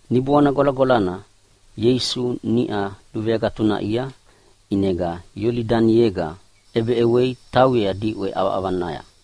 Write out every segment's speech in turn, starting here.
Niboana Gwalagwalana Ieisu niʼa luveagatunaʼia, ʼinega Iolidaniega ʼebeʼewea tauyea diʼwe ʼavaʼavaya.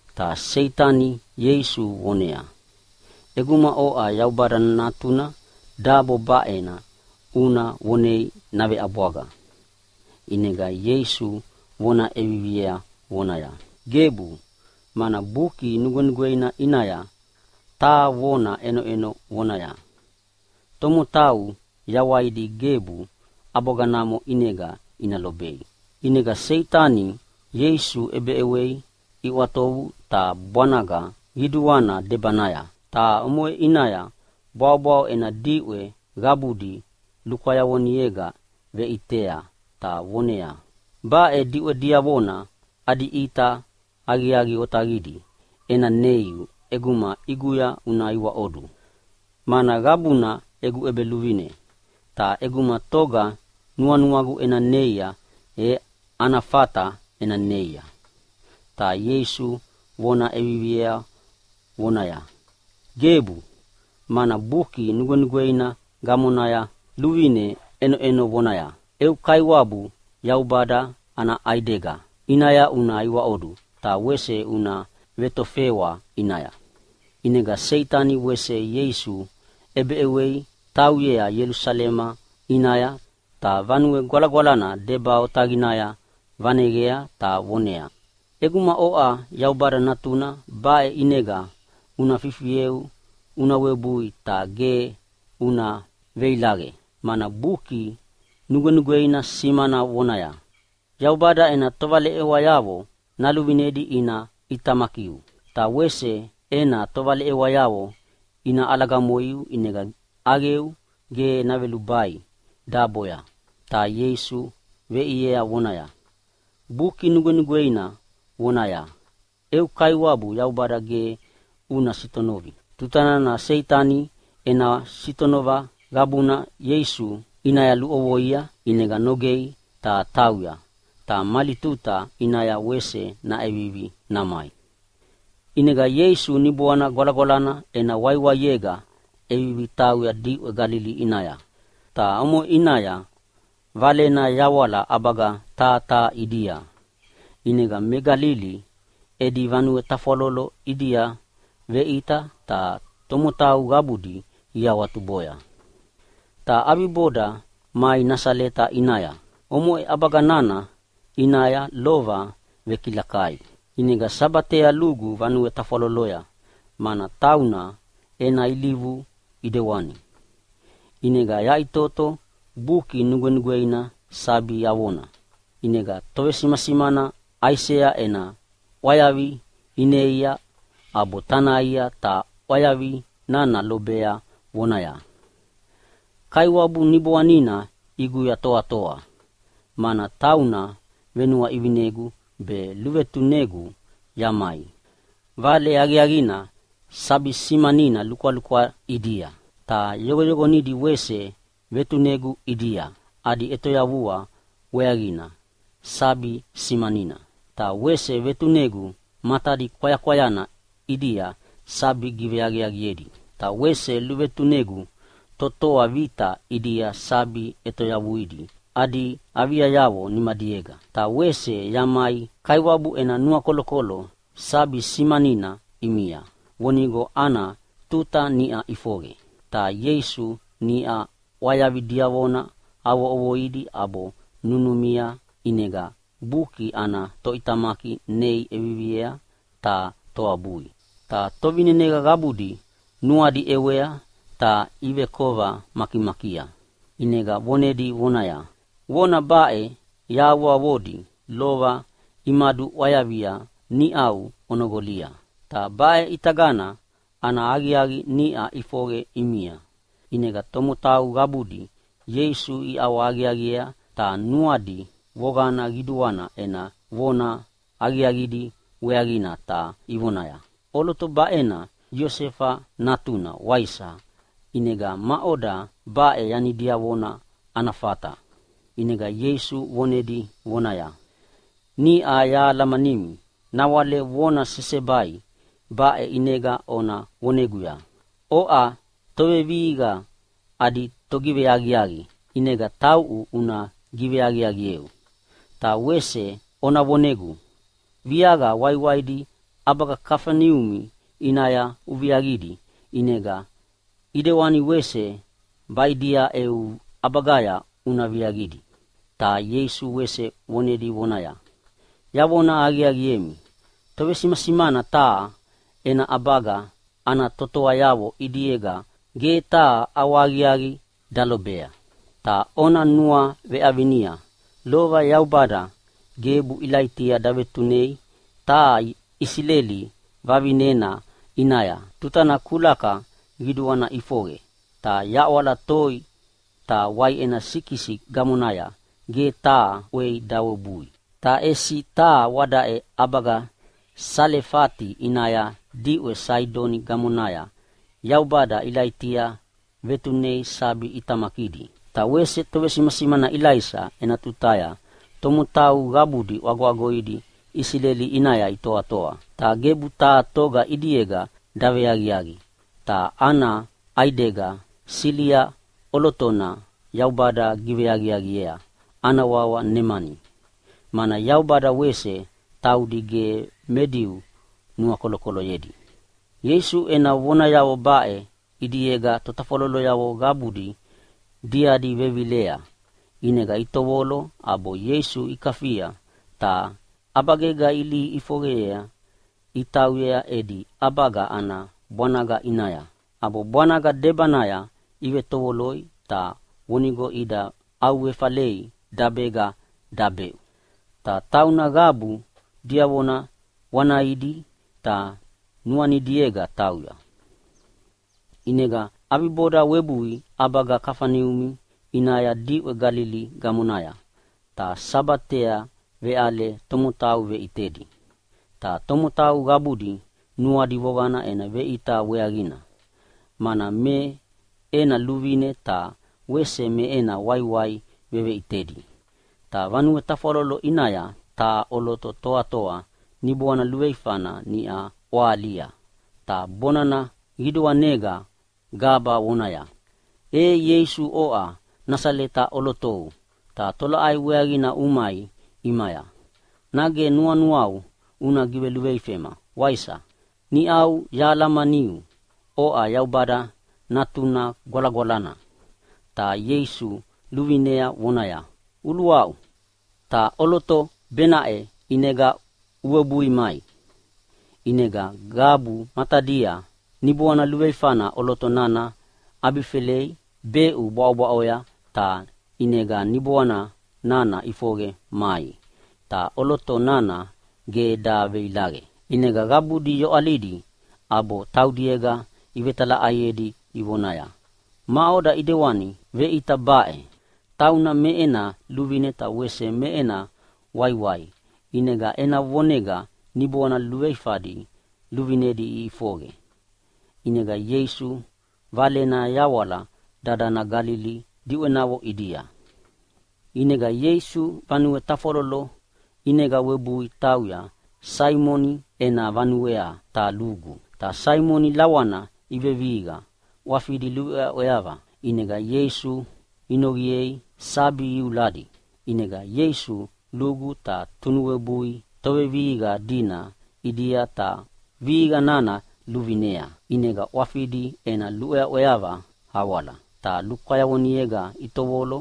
Ta Seitani Ieisu voneaya, “ʼEguma oʼa Yaubada Natuna dabo baʼena una vonei naveʼabwaga.” ʼInega Ieisu vona ʼeviviea vonaya, “Gebu, mana Buki Nugwenugweina ʼinaya taha vona ʼenoʼeno vonaya, ‘Tomotau yawaidi gebu ʼabwaganamo ʼinega ina lobei.’” ʼInega Seitani Ieisu ʼebeʼewei iʼwatovu taha bwanaga qiduana debanaya ta omoʼe ʼinaya bwaʼobwaʼo ena diʼwe qabudi lukwayavonega veʼitea ta voneaya, “Baʼe diʼwe diavona adi ʼita aqiaqi otaqidi ena neiu ʼeguma ʼiguya una iwaʼodu, mana qabuna egu ʼebeluvine, ta ʼeguma toga nuanuagu ena neia, e ana fata ena neia.” Ta Ieisu vona ʼeviviea vonaya, “Gebu, mana Buki Nugwenugweina gamonaya luvine ʼenoʼeno vonaya, ‘Eu Kaiwabu Yaubada ana ʼaidega ʼinaya una iwaʼodu, ta wese una vetofewa ʼinaya.’” ʼInega Seitani wese Ieisu ʼebeʼewei tauyea Ielusalema ʼinaya, ta Vanue Gwalagwalana deba otaqinaya vaneqea ta voneaya, “ʼEguma oʼa Yaubada Natuna, baʼe ʼinega una fifieu una webui ta ge una veilaqe. Mana Buki Nugwenugweina simana vonaya, ‘Yaubada ena tovaleʼewayavo naluvinedi ina ʼitamakiu. Ta wese ena tovaleʼewayavo ina ʼalagamoiu ʼinega ʼaqeu gebu navelubai daboya.’” Ta Ieisu veʼiea vonaya, “Buki Nugwenugweina vonaya, ‘Eu Kaiwabu Yaubada ge una sitonovi!’” Tutana Seitani ena sitonova qabuna Ieisu ʼinaya luʼovoia, ʼinega nogei ta tauya, ta mali tuta ʼinaya wese naʼevivi namai. ʼInega Ieisu Niboana Gwalagwalana ena waiwaiega ʼevivi tauya diʼwe Galili ʼinaya, ta omoʼe ʼinaya valena yawala ʼabaga taha taha ʼidia. ʼInega me Galili edi vanue tafwalolo ʼidia veʼita, ta tomotau qabudi iawatuboya. Ta ʼabiboda mai Nasaleta ʼinaya, omoʼe ʼabaga nana ʼinaya lova vekilakai. ʼInega Sabatea lugu vanue tafwaloloya, mana tauna ena ilivu ʼidewani. ʼInega yaʼitoto Buki Nugwenugweina sabi avona. ʼInega tovesimasimana Aisea ena ʼwayavi ineia, ʼabo tanaia ta ʼwayavi nana lobea vonaya, “Kaiwabu Niboanina ʼiguya toatoa, mana tauna venuaʼivinegu be luvetunegu yamai vale aqiaqina sabi simanina lukwalukwa ʼidia. Ta yoqoyoqonidi wese vetunegu ʼidia, adi ʼetoyavua weaqina sabi simanina. Ta wese vetunegu matadi kwayakwayana ʼidia sabi giveaqiaqidi. Ta wese luvetunegu totoa vita ʼidia sabi ʼetoyavuidi adi aviayavo nimadiega, ta wese yamai Kaiwabu ena nuakolokolo sabi simanina ʼimia vonigo ana tuta niʼa ʼifoqe.” Ta Ieisu niʼa ʼwayavi diavona avo ʼovoidi ʼabo nunumia, ʼinega buki ana toʼitamaki nei ʼeviviei ta toabui. Ta tovineneqa qabudi nuadi ʼewea ta ivekova makimakia, ʼinega vonedi vonaya, “Vona baʼe yahavoavodi lova imaduʼwayavia niʼau onoqolia, ta baʼe ʼitagana ana aqiaqi niʼa ʼifoqe ʼimia.” ʼInega tomotau qabudi Ieisu iʼawahaqiaqiea ta nuadi voqana qiduana ena vona aqiaqidi weaqina ta ivonaya, “ʼOloto baʼe Iosefa natuna waisa, ʼinega maʼoda baʼe yanidiavo ana fata?” ʼInega Ieisu vonedi vonaya, “Niʼa yahalamanimi nawale vona sesebai baʼe ʼinega ona voneguya, ‘Oʼa tovevihiqa adi togiveaqiaqi, ʼinega tauʼu una giveaqiaqieu!’ Ta wese ona voneguya, ‘Viaqa waiwaidi ʼabaga Kafaneumi ʼinaya uviaqidi, ʼinega ʼidewana wese baʼidia eu ʼabagaya una viaqidi.’” Ta Ieisu wese vonedi vonaya, “Yavona aqiaqiemi, tovesimasimana taha ena ʼabaga ana totoayavo ʼidiega ge taha ʼawahaqiaqi dalobea. Ta ona nuaveʼavinia lova Yaubada gebu Ilaitia davetunei taha Isileli vavinena ʼinaya tutana kulaka qiduana ʼifoqe ta yaʼwala toi ta waiʼena sikisi gamonaya ge taha ʼwei dawebui. Ta ʼesi taha wadaʼe ʼabaga Salefati ʼinaya diʼwe Saidoni gamonaya Yaubada Ilaitia vetunei sabi ʼitamakidi. Ta wese tovesimasimana Ilaisa ena tutaya tomotau qabudi ʼwagoʼwagoidi Isileli ʼinaya itoatoa. Ta gebu taha toga ʼidiega daveaqiaqi, ta ana ʼaidega Silia ʼolotona Yaubada giveaqiaqiea, ana wawa Nemani. Mana Yaubada wese taudi ge me Diu nuakolokoloyedi.” Ieisu ena vonayavo baʼe ʼidiega totafwalolo qabudi diadi vevilea. ʼInega itovolo ʼabo Ieisu ikafia ta ʼabagega ilihi ʼifoqeyea itauyea edi ʼabaga ana bwanaga ʼinaya, ʼabo bwanaga debanaya ivetovoloi ta vonigo ida ʼauefalei dabega dabeʼu. Ta tauna qabu diavona wanaidi ta nuanidiega tauya. ʼInega ʼabiboda webui ʼabaga Kafaneumi ʼinaya diʼwe Galili gamonaya, ta Sabatea veʼale tomotau veʼitedi. Ta tomotau qabudi nuadi voqana ena veʼita weaqina, mana me ena luvine ta wese me ena waiwai veveʼitedi. Ta vanue tafwalolo ʼinaya taha ʼoloto toatoa niboana luveifana niʼa ʼwahalia, ta bonana qiduanega gaba vonaya, “Ei Ieisu, oʼa Nasaleta ʼolotona, ta tolaʼai weaqina umai ʼimaya? Nage nuanuau una giveluveifema, waisa? Niʼa yahalamaniu, oʼa Yaubada Natuna Gwalagwalana.” Ta Ieisu luvinea vonaya, “Uluaʼu, ta ʼoloto benaʼe ʼinega uwebui mai!” ʼInega qabu matadia niboana luveifana ʼoloto nana ʼabifelei beʼu bwaʼobwaʼoya, ta ʼinega niboana nana ʼifoqe mai, ta ʼoloto nana ge daveilaqe. ʼInega qabudi yoʼalidi ʼabo taudiega ivetalaʼaiedi ivonaya, “Maʼoda ʼidewani veʼita baʼe? Tauna me ena luvine ta wese me ena waiwai, ʼinega ena vonega niboana luveifadi luvinedi iʼifoqe.” ʼInega Ieisu Valena yawala dadana Galili diʼwenavo ʼidia. ʼInega Ieisu vanue tafwalolo ʼinega webui tauya Saimoni ena vanuea ta lugu. Ta Saimoni lawana ivevihiqa ʼwafidi luʼweaʼweava. ʼInega Ieisu inoqiea sabi iuladi. ʼInega Ieisu lugu ta tunuwebui tovevihiqa dina ʼidia ta vihiqa nana luvinea. ʼInega ʼwafidi ena luʼweaʼweava awala. Ta lukwayavonega itovolo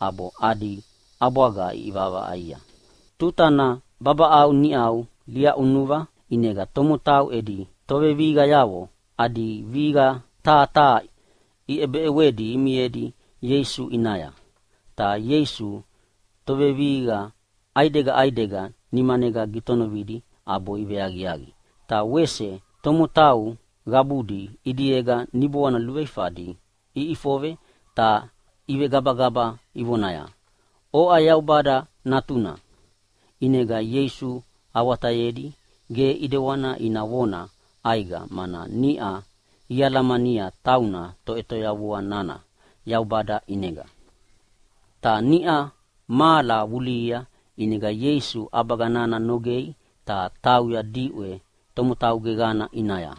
ʼabo adi ʼabwaga iʼivaʼavaʼaia. Tutana babaʼau niʼa liaʼunuva ʼinega tomotau edi tovevihiqayavo adi vihiqa taha taha iʼebeʼewedi imiedi Ieisu ʼinaya. Ta Ieisu tovevihiqa ʼaidega ʼaidega nimanega gitonovidi ʼabo iveaqiaqi. Ta wese tomotau qabudi ʼidiega niboana luveifadi iʼifoqe ta ivegabagaba ivonaya, “Oʼa Yaubada Natuna!” ʼInega Ieisu awatayedi ge ʼedewani ina vona ʼaiqa, mana niʼa ialamania tauna Toʼetoyavua nana Yaubada ʼinega. Ta niʼa mahala vulihia ʼinega Ieisu ʼabaga nana nogei ta tauya diʼwe tomotau geqana ʼinaya.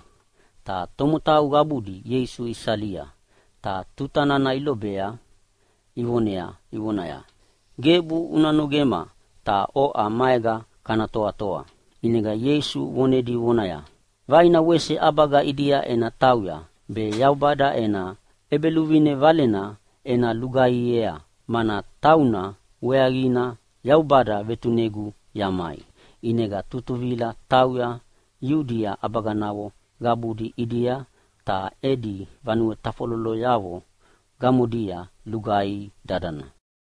Ta tomotau qabudi Ieisu isalia, ta tutana ilobea ivonea ivonaya, “Gebu una nogema ta oʼa maega kana toatoa.” ʼInega Ieisu vonedi vonaya, “Vaina wese ʼabaga ʼidia ena tauya be Yaubada ena ʼEbeluvine valena ena lugaihiea, mana tauna weaqina Yaubada vetunegu yamai.” ʼInega tutuvila tauya Iudia ʼabaganavo qabudi ʼidia, ta edi vanue tafwaloloyavo gamodia lugaihi dadana.